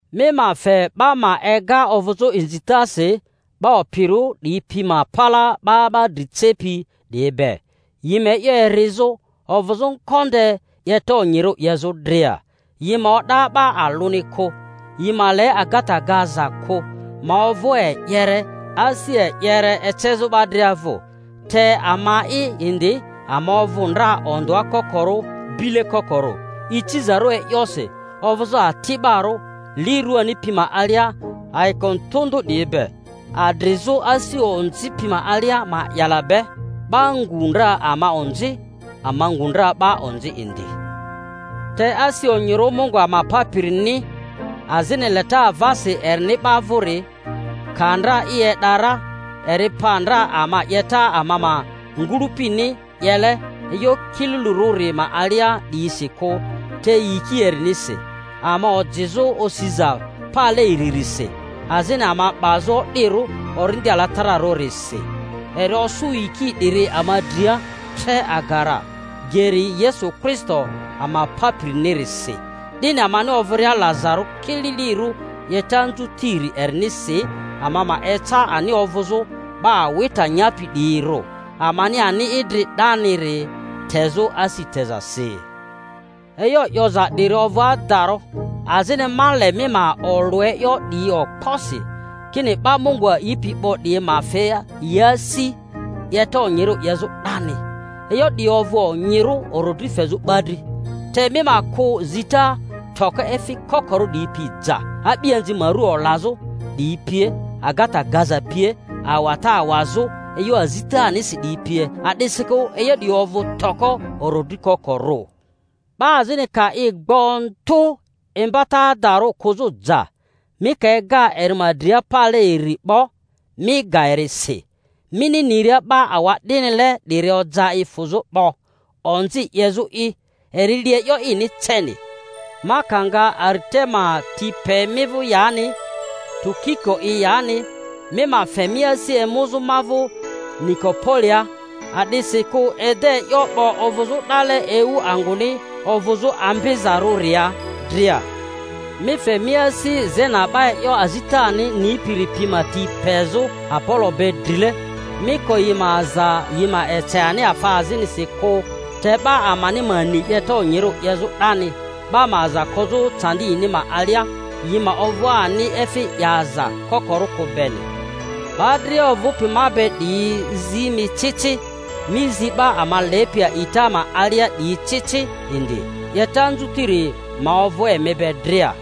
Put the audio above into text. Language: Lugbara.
Mi ma fe 'ba ma ega ovᴜzᴜ inzitasi 'ba opirᴜ 'diyi pi ma palaa 'ba 'ba dri cepi 'diyi be, yi ma e'yo erizᴜ, ovᴜzᴜ ngonde 'yeta onyirᴜ 'yezᴜ dria, yi ma o'da 'ba alᴜni kᴜ, yi ma le agata gaza kᴜ, ma ovᴜ e'yere, asi e'yere ecezᴜ 'ba dria vᴜ. Te ama'i indi, ama ovᴜ ndra ondᴜa kokorᴜ, bile kokorᴜ, icizarᴜ e'yosi, ovᴜzᴜ ati'barᴜ li ruani pi ma alia ayiko ndᴜ ndᴜ 'diyi be, adrizᴜ asi onzi pi ma alia ma'yala be, 'ba ngu ndra ama onzi, ama ngu ndra 'ba onzi indi. Te asi onyirᴜ Mungu ama Papirini, azini leta avasi erini 'ba vᴜri, ka ndra i e'da ra, eri pa ndra ama 'yeta ama ma ngᴜlᴜpini 'yele e'yo kililirᴜri ma alia 'diyisi kᴜ, te yiki erinisi, ama ojizᴜ osiza pale iririsi azini ama 'bazᴜ o'dirᴜ Orindi Alatararᴜrisi; eri osᴜ yiki 'diri ama dria tre aga ra, geri Yesu Kristo ama Papirinirisi, 'dini amani ovᴜria lazarᴜ kililirᴜ 'yeta anzutiri erinisi ama ma eca ani ovᴜzᴜ 'ba awita nyapi 'diyirᴜ, amani ani idri 'daniri tezᴜ asi tezasi. E'yo 'yoza 'diri ovᴜ adarᴜ. Azini ma le mi ma olᴜ e'yo 'diyi okposi, kini 'ba Mungu a'ipi 'bo 'diyi ma fe yi asi 'yeta onyirᴜ 'yezᴜ 'dani. E'yo 'diyi ovᴜ onyirᴜ orodri fezᴜ 'ba dri. Te mi ma kᴜ zita toko efi kokorᴜ 'diyi pi ja, a'bianzi ma ru olazᴜ 'diyi pie, agata gaza pie, awata awazᴜ e'yo azitanisi 'diyi pie; a'disikᴜ e'yo 'diyi ovᴜ toko orodri kokorᴜ. 'Ba azini ka i gbᴜ ndᴜ imbata adarᴜ kᴜzᴜ ja, mi ka ega eri ma dria pale iri 'bo, mi ga eri si, mini niria 'ba awa'dinile 'diri oja i fᴜzᴜ 'bo, onzi 'yezᴜ'i; eri li e'yo ini ceni. Ma ka nga Aritema ti pe mi vᴜ, yani Tukiko'i yani, mi ma fe mi asi emuzᴜ ma vᴜ Nikopolia, a'disikᴜ ede e'yo 'bo ovᴜzᴜ 'dale ewu angᴜni ovᴜzᴜ ambizarᴜria dria. Mi fe mi asi Zena 'ba e'yo azitani nipiri pi ma ti pezᴜ Apolo be drile; mi ko yi ma aza yi ma ece ani afa azinisi kᴜ. Te 'ba amani ma ni 'yeta onyirᴜ 'yezᴜ 'dani, 'ba ma aza kozᴜ candi yini ma alia, yi ma ovᴜ ani efi 'yaza kokorᴜ kᴜ beni. 'Ba dria ovᴜpi ma be 'diyi zi mi ci ci. Mi zi 'ba ama lepi a'ita ma alia 'diyi ci ci indi. 'Yeta anzuriri ma ovᴜ emi be dria.